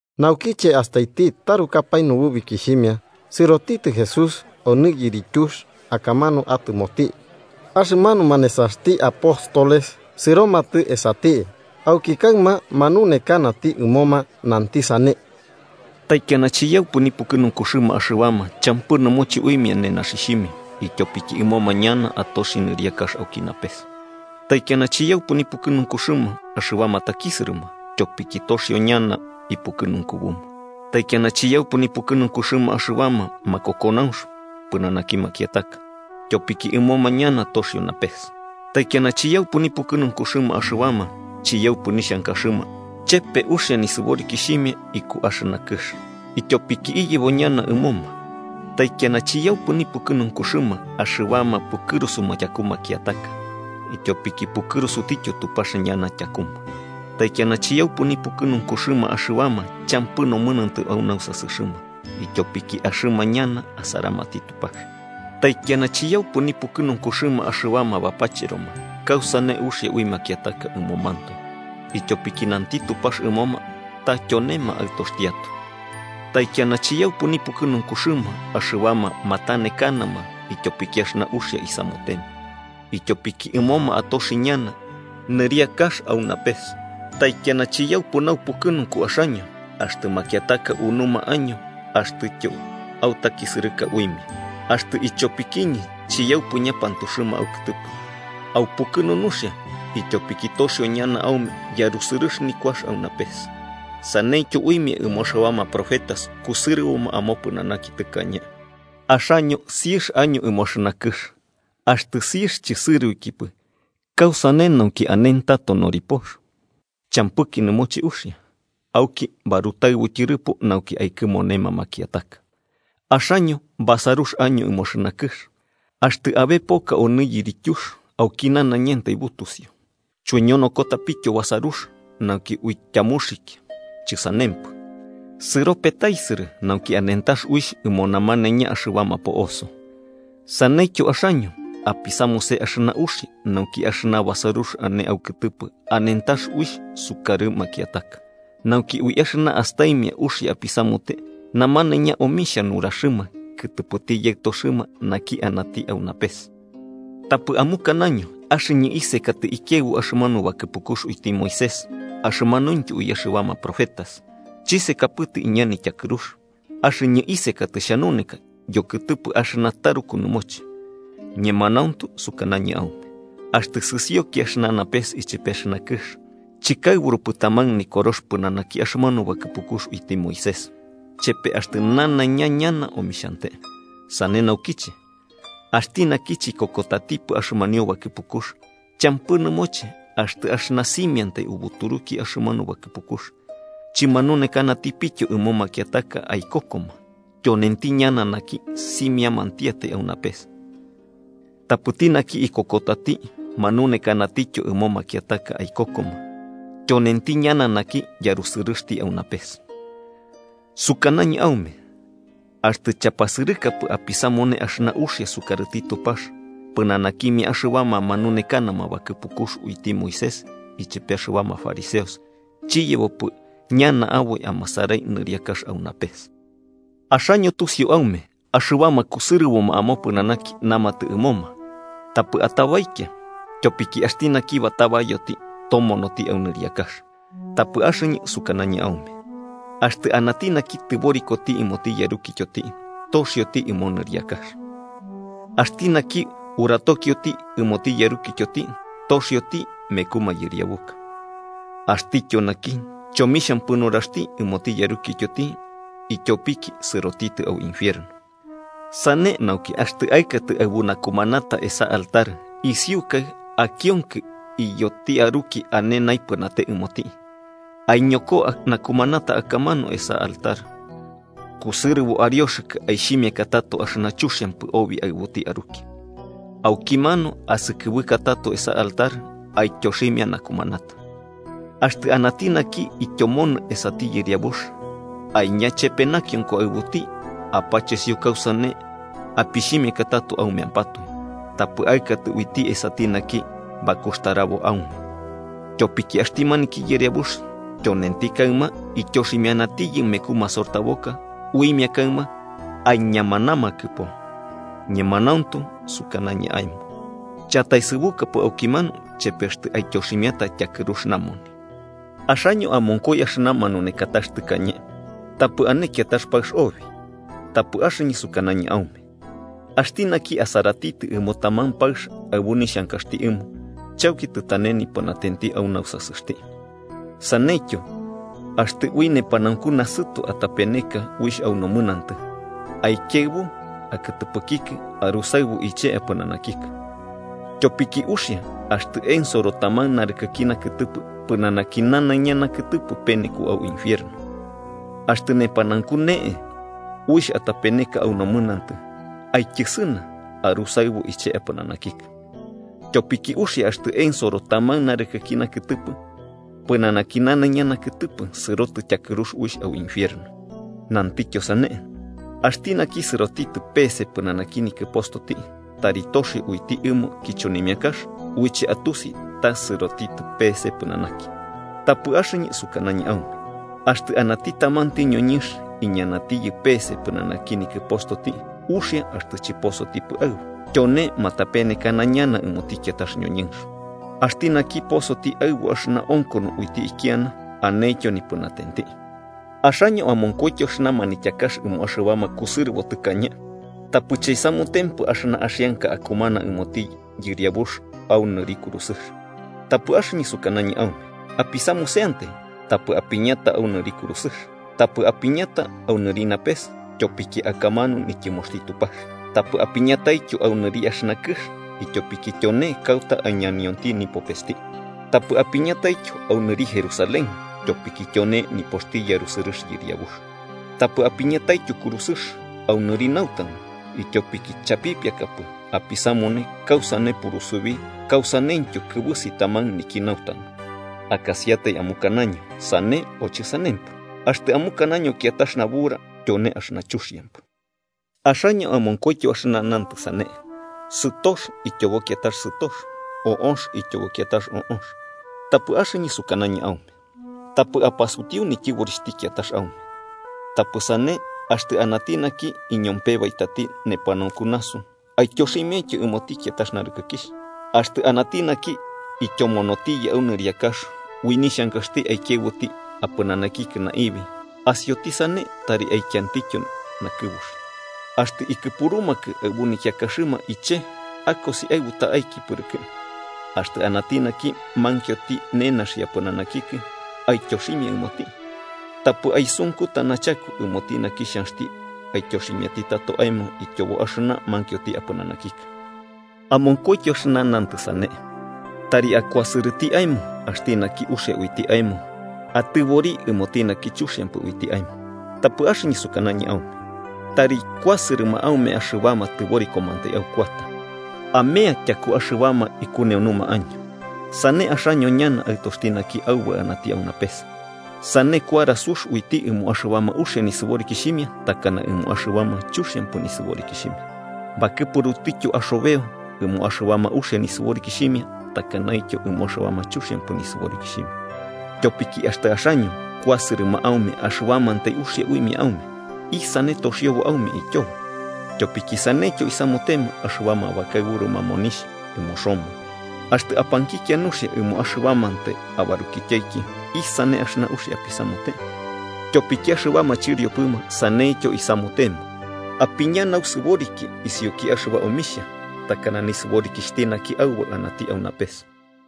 Naukiche astaiti tarukapae nububikixhimia, sɨrotitɨ Jesús onɨ yirityux akamanu atɨmoti. Axɨmanuma nesaxti apóstoles sɨromatɨ esati, auki kaɨma manunekanati ɨmoma, nanti sane: “Taikiana chiyaupɨ nipukɨnunkuxɨma axɨbama champɨ nɨmoche uimia nenaxixhimia, ityopiki ɨmoma ñana atoxi nɨriakax auki napes. “Taikiana chiyaupɨ nipukɨnunkuxɨma axɨbama takisɨrɨma, tyopiki toxio ñana ipukɨnunkubuma. “Taikiana chiyaupɨ nipukɨnunkuxɨma axɨbama makokonaunx pɨnanaki makiataka, ityopiki ɨmoma ñana toxio napes. “Taikiana chiyaupɨ nipukɨnunkuxɨma axɨbama chiyaupɨ nixhankaxɨma chepe uxia nisɨborikixhimia iku axɨna kɨx, ityopiki iyebo ñana ɨmoma. “Taikiana chiyaupɨ nipukɨnunkuxɨma axɨbama pukɨrusuma tyaku makiataka, ityopiki pukɨrusutityo Tupax ñana tyakuma. “Taikiana chiyaupɨ nipukɨnunkuxɨma axɨbama champɨ nomɨnantɨ au nausasɨxɨma, ityopiki axɨma ñana asaramati Tupax. “Taikiana chiyaupɨ nipukɨnunkuxɨma axɨbama bapacheroma kausane uxia ui makiataka ɨmomantoe, ityopiki nanti Tupax ɨmoma ta tyonema aɨtoxtiatoe. “Taikiana chiyaupɨ nipukɨnunkuxɨma axɨbama matanekanama ityopiki axɨna uxia isamutema, ityopiki ɨmoma atoxi ñana nɨriakax au napes. “Taikiana chiyaupɨ naupukɨnunku axaño, axtɨ makiataka unuma año axtɨtyo autakisɨrɨka uimia, axtɨ ichopikiñɨ chiyaupɨ ñapantuxɨma aukɨtɨpɨ. Aupukɨnu, nuxia, ityopiki toxio ñana aume yarusɨrɨx nikuax au napes. Saneityo uimia ɨmo axɨbama profetas kusɨrɨboma amopɨnanaki tɨkañe. “Axaño siɨx año ɨmo axɨna kɨx. Axtɨ siɨx chɨsɨroikipɨ, ¿kausane nauki anentato noripox? Champɨki nɨmoche uxia, auki barutaɨbu tyɨrɨpo nauki aikɨmonema makiataka. “Axaño basarux año ɨmo axɨna kɨx. Axtɨ abe poka onɨ yirityux auki nanaiña butusiu. Chuiñonokotapityo basarux nauki uityamuxikia. Chɨsanempɨ, sɨro petaisɨrɨ nauki anentax uixh ɨmo namanaiña axɨbama po'oso. Saneityo axaño, apisamuse axɨna uxia nauki axɨna basarux ane aukɨtɨpɨ anentax uixh sukarɨ makiataka, nauki, ui axɨna astaimia uxia apisamute, namanaiña omixhia nuraxɨma kɨtɨpɨti Yaɨtoxɨma naki anati au napes. “Tapɨ amukanaño axɨñɨ isekatɨ ikiaɨbu axɨmanu bakɨpukux uiti Moisés axɨmanuintyo ui axɨbama profetas. Chisekapɨtɨ iña nityakɨrux, axɨñɨ isekatɨ xhanuneka yokɨtɨpɨ axɨna taruku nɨmoche. Ñemanauntu sukanañɨ aume, axtɨ sɨsioki axɨna napes ichepe axɨna kɨx, chɨkaɨburupɨ taman Nikorox pɨnanaki axɨmanu bakɨpukux uiti Moisés, chepe axtɨ nanaiña ñana omixhante. Sane naukiche, axti naki chikokotatipɨ axɨmanio bakɨpukux, champɨ nɨmoche axtɨ axɨna simiamantai ubuturuki axɨmanu bakɨpukux, chɨmanunekanatipityo ɨmo makiataka aikokoma, tyonenti ñana naki simiamantiatai au napes. Tapɨti naki ikokotati manunekanatityo ɨmo makiataka aikokoma, tyonenti ñana naki yarusɨrɨxti au napes. “Sukanañɨ aume, axtɨ chapasɨrɨkapɨ apisamune axɨna uxia sukarɨti Tupax, pɨnanakimia axɨbama manunekanama bakɨpukux uiti Moisés ichepe axɨbama fariseos chiyebopɨ ñana aboi amasarai nɨriakax au napes. “Axaño tusiu aume axɨbama kusɨrɨboma amopɨnanaki namatɨ ɨmoma: ‘Tapɨ atabaikia, tyopiki axti naki batabayoti tomonoti au nɨriakax.’ Tapɨ axɨñɨ sukanañɨ aume, axtɨ anati naki tɨborikoti ɨmoti yarukityoti, toxioti ɨmo nɨriakax. Axti naki uratokioti ɨmoti yarukityoti toxioti meku mayɨriabuka. Axtityo naki chomixhampɨ nuraxti ɨmoti yarukityoti, ityopiki sɨrotitɨ au infierno. “Sane nauki, axtɨ aɨkatɨ aɨbu nakumanata esa altar isiukai akionkɨ iyoti aruki ane naipɨnate ɨmoti, aiñoko nakumanata akamanu esa altar kusɨrɨbo arioxɨkɨ aixhimiaka tato axɨna chuxiampɨ obi aɨbuti aruki. Aukimanu asɨkɨbɨka tato esa altar aityoximia nakumanata. “Axtɨ anati naki ityomonɨ esati yɨriabux, aiña chepe nakionko aɨbuti apachesio kausane apixhimiaka tato aumeampatoe, tapɨ aɨkatɨ uiti esati naki bakuxtarabo aume. Tyopiki axti maniki yɨriabux tyonenti kaɨma ityoximianatiyɨ meku masortaboka uimia kaɨma aiñamanamakɨpo. Ñemanauntu sukanañɨ aemo chataesɨbukapɨ aukimanu chepe axtɨ aityoximiata tyakɨrux namoni. “Axaño amonkoi axɨna manunekatax tɨkañe: ‘Tapɨ ane kiatax paɨx obi.’ Tapɨ axɨñɨ sukanañɨ aume axti naki asaratitɨ ɨmo taman paɨx aɨbu nixhankaxti ɨmo, chauki tɨtane nipɨnatenti au nausasɨxti. “Saneityo, axtɨ ui nepanaunku nasɨto atapeneka uixh au nomɨnantɨ, aikiaɨbu akɨtɨpɨkikɨ arusaɨbu iche apɨnanakikɨ. Tyopiki uxia axtɨ ensoro taman narɨkɨki nakɨtɨpɨ, pɨnanaki nanaiña nakɨtɨpɨ peneko au infierno. Axtɨ nepanaunku ne'e uixh atapeneka au nomɨnantɨ, aityɨsɨna arusaɨbu iche apɨnanakikɨ. Tyopiki uxia axtɨ ensoro taman narɨkɨki nakɨtɨpɨ, pɨnanaki nanaiña nakɨtɨpɨ sɨrotɨ tyakɨrux uixh au infierno. “Nantityo sane: ‘Axti naki sɨroti peese pɨnanaki nikɨpostoti, tari toxio uiti ɨmo kichonimiakax uiche atusi ta sɨroti peese pɨnanaki.’ Tapɨ axɨñɨ sukanañɨ aume axtɨ anati tamanti ñoñɨnx iñanatiyɨ peese pɨnanaki nikɨpostoti, uxia axtɨ chɨposotipɨ aɨbu, tyone matapenekana ñana ɨmoti kiatax ñoñɨnx. Axti naki posoti aɨbu axɨna onkono uiti ikiana, anentyo nipɨnatenti. “Axaño amonkoityo axɨna manityakax ɨmo axɨbama kusɨrɨbo tɨkañe: ‘Tapɨ chaisamutempɨ axɨna axianka akumana ɨmoti Yɨriabux au nɨri kurusɨx.’ Tapɨ axɨñɨ sukanañɨ aume: apisamuseantai, tapɨ apiñata au nɨri kurusɨx. Tapɨ apiñata au nɨri napes, tyopiki akamanu nityɨmoxti Tupax. Tapɨ apiñataityo au nɨri axɨna kɨx, ityopiki tyone kauta aiñanionti nipopesti. Tapɨ apiñataityo au nɨri Jerusalén, tyopiki tyone nipoxti yarusɨrɨx Yɨriabux. Tapɨ apiñataityo kurusɨx au nɨri nautanu, ityopiki chapipiakapɨ apisamune kausane purusubi kausaneityo kɨbɨsi taman niki nautanu. Akasiatai amukanaño ‘sane’ o ‘chɨsanempɨ.’ Axtɨ amukanaño kiatax nabura, tyone axɨna chuxiampɨ. “Axaño amonkoityo axɨna nantɨ sane: ‘Sɨtox ityobo kiatax sɨtox o'ox ityobo kiatax o'ox.’ Tapɨ axɨñɨ sukanañɨ aume: Tapɨ apasutiu nityɨborixhti kiatax aume. Tapɨ sane, axtɨ anati naki iñompebaitati nepanaunku nasu, aityoximiaintyo ɨmoti kiatax narɨkɨkixh. Axtɨ anati naki ityomonotiyɨ au nɨriakax ui nixhankaxti aikiaɨbuti apɨnanakikɨ naibi, asioti sane tari aikiantityo nakɨbuxi. Axtɨ ikɨpurumakɨ aɨbu nikiakaxɨma iche akosi aɨbu ta'aiki pɨrɨkɨ. Axtɨ anati naki mankioti nenaxi apɨnanakikɨ, aityoximia ɨmoti. Tapɨ aisunkuta nachaku ɨmoti naki xhanxti aityoximiati tato aemo ityobo axɨna mankioti apɨnanakikɨ. “Amonkoityo axɨna nantɨ sane: ‘Tari akuasɨrɨti aemo axti naki uxia uiti aemo atɨbori ɨmoti naki chuxiampɨ uiti aemo.’ Tapɨ axɨñɨ sukanañɨ aume: Tari kuasɨrɨma aume axɨbama tɨborikomantai aukuata, amea tyakuma axɨbama ikuneunuma año. Sane axaño ñana aɨtoxti naki Aubaɨ anati au napes. Sane kuara sux uiti ɨmo axɨbama uxia nisɨborikixhimia takana ɨmo axɨbama chuxiampɨ nisɨborikixhimia, bakɨpurutityo axobeo ɨmo axɨbama uxia nisɨborikixhimia takanaityo ɨmo axɨbama chuxiampɨ nisɨborikixhimia. Tyopiki axtɨ axaño kuasɨrɨma aume axɨbamantai uxia uimia aume, ¿isane toxiobo aume ityobo? Tyopiki saneityo isamutema axɨbama bakaɨburuma monixh ɨmo Roma. Axtɨ apankikia nuxia ɨmo axɨbamantai abarukityaiki, ¿isane axɨna uxia apisamute? Tyopiki axɨbama chɨriopɨma saneityo isamutema. Apiña nausɨboriki isiuki axɨba omixhia, takana nisɨborikixhti naki Aubaɨ anati au napes.